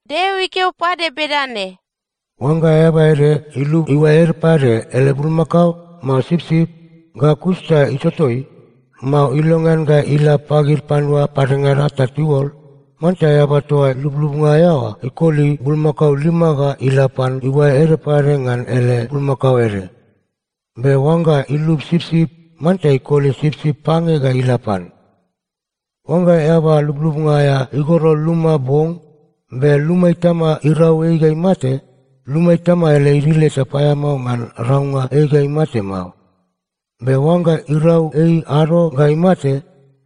Deo ikeo pade bedane, “Oangga eaba ede ilub iuae ede pade ele bulmakao, mao sipsip, ga kus ta itotoi, mao ilongean ga ila pagid panua padengada ta tiuol, manta eaba toa lublubnga aea oa ikoli bulmakao lima ga ila pan iuae ede pade ngan ele bulmakao ede. Be oangga ilub sipsip, manta ikoli sipsip pange ga ila pan. “Oangga eaba lublubnga aea igoro luma bong, be luma itama irau ei ga imate, luma itama ele idil eta paeamao ngan raunga ei ga imate mao. Be oangga irau ei ado ga imate,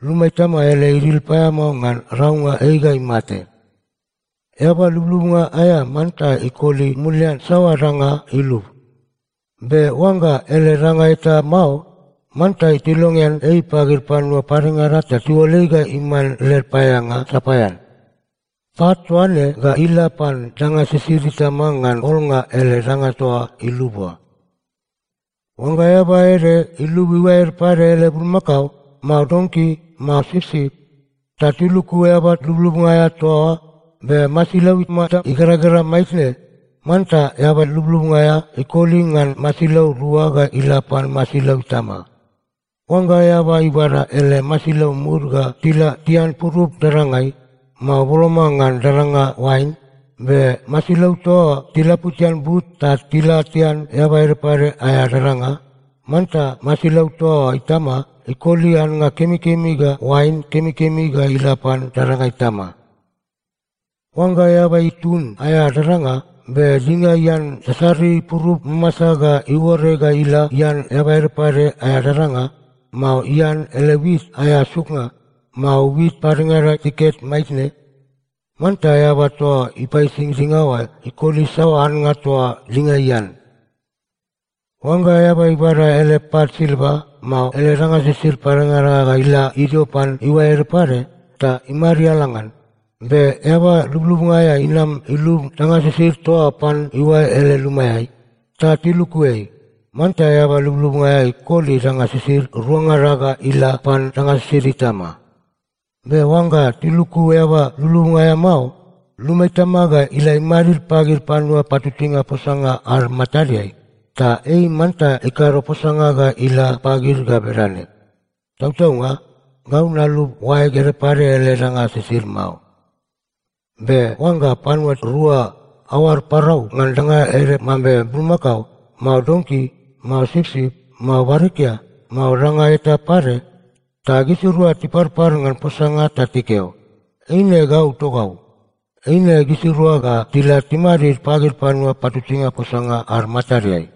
luma itama ele idil paeamao ngan raunga ei ga imate. “Eaba lublubnga aea manta ikoli mulian saoa danga ilub. Be oangga ele danga eta mao, manta tilongean ei pagid panua padengada ta tiuol ei ga iman led paeaeanga sapaean. Pat toa ne ga ila pan danga sisid itama ngan olnga ele danga toa ilub oa. “Oangga eaba ede ilub iuae ede pade ele bulmakao, mao donki, mao sipsip, ta tiluku eaba lublubnga aea toa oa, be masilau imata igeragera maitne, manta eaba lublubnga aea ikoli ngan masilau rua ga ila pan masilau itama. “Oangga eaba ibada ele masilau mud ga tila tian purup dadangai, mao boloma ngan dadanga oain, be masilau toa oa tilaputian but ta tila tian eaba ede pade aea dadanga, manta masilau toa oa itama ikoli annga kemikemi ga oain kemikemi ga ila pan dadanga itama. “Oangga eaba itun aea dadanga, be dinga ian sasari purup mamasa ta iuore ga ila ian eaba ede pade aea dadanga, mao ian ele wit aea suknga, mao wit padengada tiket maitne, manta eaba toa ipaisi dinga oa ikoli saoa annga toa dinga ian. “Oangga eaba ibada ele pat silva, mao ele danga sisid padengada ga ila idio pan iuae ede pade, ta imariala ngan, be eaba lublubnga aea inam ilub danga sisid toa oa pan iuae ele lumaeai, ta tiluku ei, manta eaba lublubnga aea ikoli danga sisid ruangada ga ila pan danga sisid itama. Be oangga tiluku eaba lublubnga aea mao, luma itama ga ila imadid pagid panua patutuinga posanga ad matadeai, ta ei manta ikado posanga ga ila pagid ga bedane, ‘Tautaunga, gau nalub oaeg ede pade ele danga sisid mao.’ Be oangga panua rua aoad parau ngan danga ede mambe bulmakao, mao donki, mao sipsip, mao barikia, mao danga eta pade, ta gisirua tiparpar ngan posanga ta tikeo, ‘Eine gau togau,’ eine gisirua ga tila timadid pagid panua patutuinga posanga ad matadeai.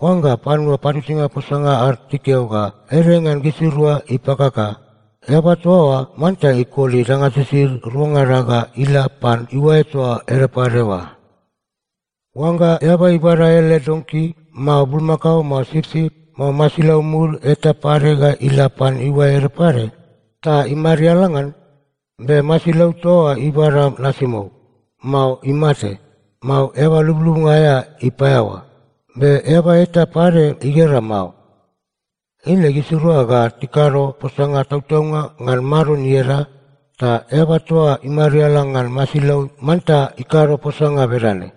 Oangga panua patutuinga posanga ad tikeo ga ede ngan gisirua ipakaka, eaba toa oa manta ikoli danga sisid ruangada ga ila pan iuae toa ede pade oa. “Oangga eaba ibada ele donki, mao bulmakao, mao sipsip, mao masilau mud eta pade ga ila pan iuae ede pade, ta imariala ngan, be masilau toa oa ibada nasimou, mao imate, mao eaba lublubnga aea ipaeaoa, be eaba eta pade igera mao, eine gisirua ga tikado posanga tautaunga ngan Maron ieda, ta eaba toa imariala ngan masilau manta ikado posanga bedane,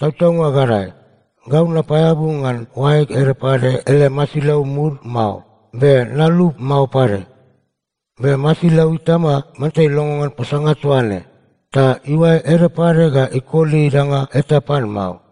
‘Tautaunga gadae, gau napaeabu ngan oaeg ede pade ele masilau mud mao, be nalub mao pade.’ Be masilau itama manta ilongo ngan posanga toa ne. Ta iuae ede pade ga ikoli danga eta pan mao.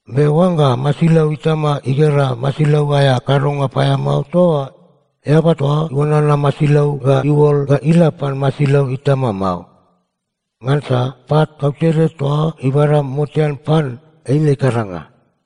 Be oangga masilau itama igera masilau aea kadonga paeamao toa oa, eaba toa iuanana masilau ga iuol ga ila pan masilau itama mao. Ngansa pat kautede toa ibada motean pan, eine ikaranga.”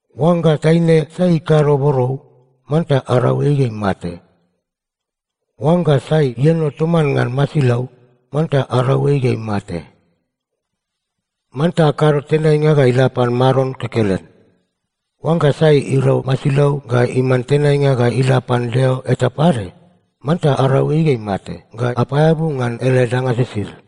“Oangga taine sai ikado borou, manta arau ei ga imate. “Oangga sai ieno toman ngan masilau, manta arau ei ga imate. “Manta akado tenainga ga ila pan Maron kekelen. Oangga sai irau masilau ga iman tenainga ga ila pan deo eta pade, manta arau ei ga imate ga apaeabu ngan ele danga sisid.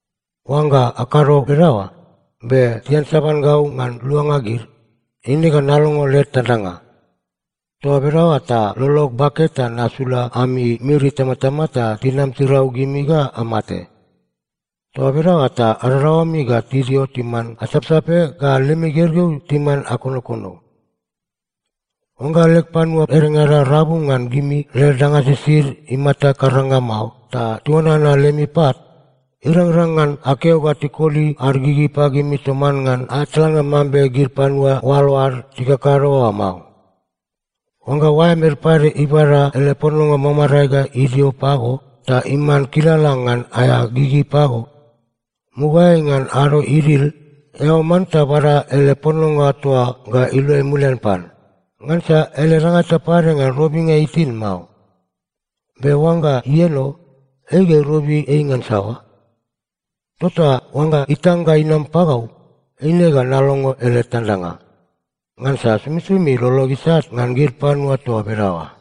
Oangga akado bedaoa, be tiansaban gau ngan luanga gid, eine ga nalongo led tandanga. Toa bedaoa ta lolog bake ta nasula ami miri itamatama ta tinam tirau gimi ga amate. Toa bedaoa ta adadaoami ga tidio timan asapsape ga lemi gergeu timan akonokono. “Oangga leg panua edengada rabu ngan gimi led danga sisid imata karanga mao ta tiuanana lemi pat, irangrang ngan akeo ga tikoli ad gigi pagimi toman ngan aea tlannga mambe gid panua oalo ad tikakado oa mao. Oangga oaem ede pade ibada ele pononga mamarae ga idio pago ta iman kilala ngan aea gigi pago, mugaeai ngan ado idil, eao manta bada ele pononga toa oa ga iluai mulian pan. Ngansa ele danga eta pade ngan robinga itin mao. Be oangga ieno, ei ga irobi ei ngan saoa? Tota oangga itang ga inam pagau, eine ga nalongo ele tandanga. Ngansa somisomi lolog isat ngan gid panua toa bedaoa.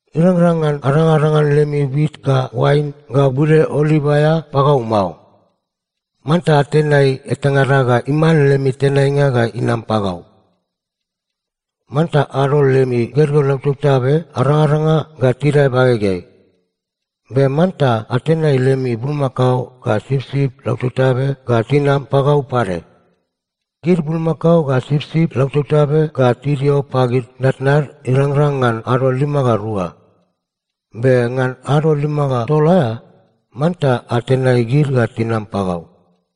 “Irangrang ngan adangadangan lemi wit ga oain ga bude oliv aea pagau mao. Manta atenai etangada ga iman lemi tenainga ga inam pagau. “Manta adol lemi gergeu lautabtabe arangaranga ga tidae bagegeai. Be manta atenai lemi bulmakao ga sipsip lautabtabe ga tinam pagau pade. Gid bulmakao ga sipsip lautabtabe ga tidio pagid tnatnad irangrang ngan ado lima ga rua. Be ngan ado lima ga tol aea, manta atenai gid ga tinam pagau.